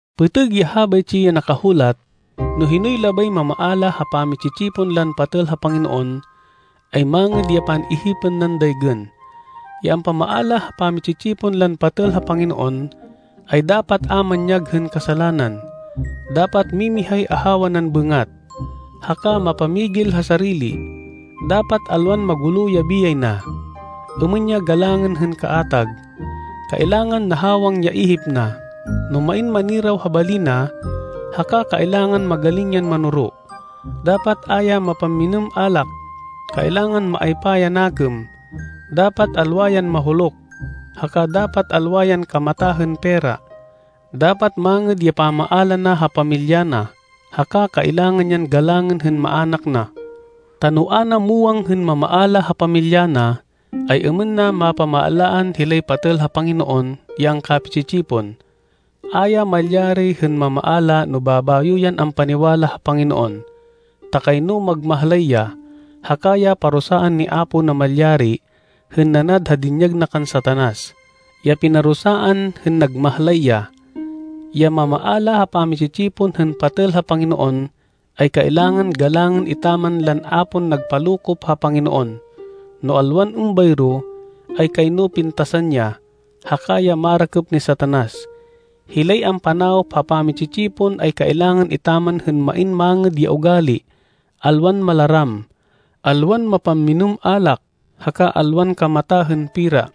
Pêtêg ya habaytsi ya nakahulat: No hinoy labay mamaala ha pami-tsi-tsipon lan patêl ha Panginoon, ay mangêd ya pan-ihipên nan daygên. Ya ampamaala ha pami-tsi-tsipon lan patêl ha Panginoon, ay dapat a manyag hên kasalanan. Dapat mimihay ahawa nan bêngat, haka mapamigil ha sarili. Dapat alwan magulo ya biyay na, êmên ya galangên hên kaatag. Kailangan nahawang ya ihip na, no main maniraw ha bali na, haka kailangan magaling yan manoro. Dapat a ya mapamminêm alak, kailangan maaypa ya nakêm, dapat alwa yan mahuluk, haka dapat alwa yan kamata hên pera. Dapat mangêd ya pamaala na ha pamilya na, haka kailangan yan galangên hên maának na. Ta no a na muwang hên mamaala ha pamilya na, ay-êmên na mapamaalaan hilay patêl ha Panginoon ya angkapi-tsi-tsipon? A ya malyari hên mamaala no babayo yan ampaniwala ha Panginoon, ta kayno magmahlay ya, haka ya parusaan ni Apo Namalyari hên nanad ha dinyag na kan Satanas, ya pinarusaan hên nagmahlay ya. Ya mamaala ha pami-tsi-tsipon hên patêl ha Panginoon, ay kailangan galangên etaman lan a pon nagpalokop ha Panginoon. No alwan êmbayro, ay kayno pintasan ya, haka ya marakêp ni Satanas. Hilay ampanawop ha pami-tsi-tsipon ay kailangan etaman hên main mangêd ya ugali, alwan malaram, alwan mapamminêm alak, haka alwan kamata hên pera.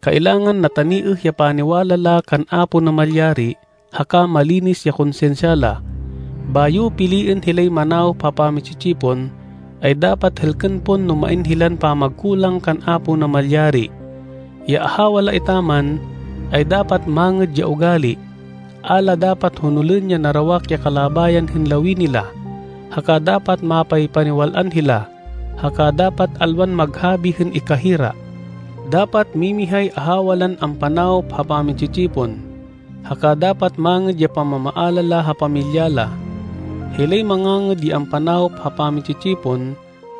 Kailangan nataniêh ya paniwala la kan Apo Namalyari haka malinis ya konsinsya la. Bayo piliên hilay manawop ha pami-tsi-tsipon, ay dapat hêlkên pon no main hilan pamagkulang kan Apo Namalyari. Ya ahawa la etaman, ay dapat mangêd ya ugali, a la dapat honolên ya narawak ya kalabayan hên lawini la, haka dapat mapaypaniwal-an hila, haka dapat alwan maghabi hên ikahira. Dapat mimihay ahawa lan ampanawop ha pami-tsi-tsipon, haka dapat mangêd ya pamamaala la ha pamilya la. Hilay mangangêd ya ampanawop ha pami-tsi-tsipon,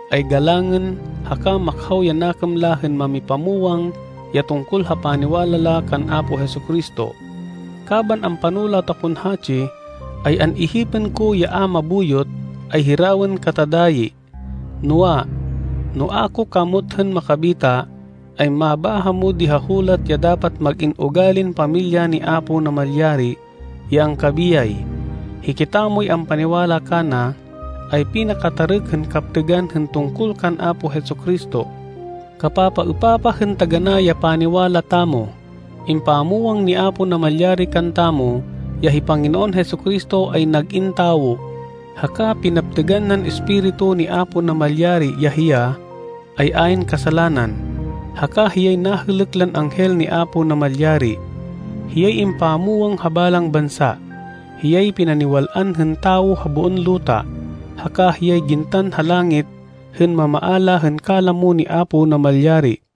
ay galangên, haka makhaw ya nakêm la hên mámipamwang ya tungkol ha paniwala la kan Apo Jesu-Cristo. Kaban ampanulat akon hatsi, ay an-ihipên ko ya a mabuyot, ay hirawên kata dayi. Noa, no a ko kamot hên makabita, ay mabáha mo di ha hulat ya dapat mag-in ugalin pamilya ni Apo Namalyari, ya angkabiyay. Hikitamoy ampaniwala kana, ay pinakatarêk hên kaptêgan hên tungkol kan Apo Jesu-Cristo. Kapapaêpapah hên taganá ya paniwala tamo: Impamwang ni Apo Namalyari kantamo ya hi Panginoon Jesu-Cristo, ay nag-in tawo, haka pinaptêgan nan Espiritu ni Apo Namalyari ya hiya, ay ayn kasalanan, haka hiyay nahêlêk lan anghel ni Apo Namalyari. Hiyay impamwang ha balang bansa. Hiyay pinaniwal-an hên tawo ha boon luta, haka hiyay gintan ha langit hên mamaala hên kalamo ni Apo Namalyari.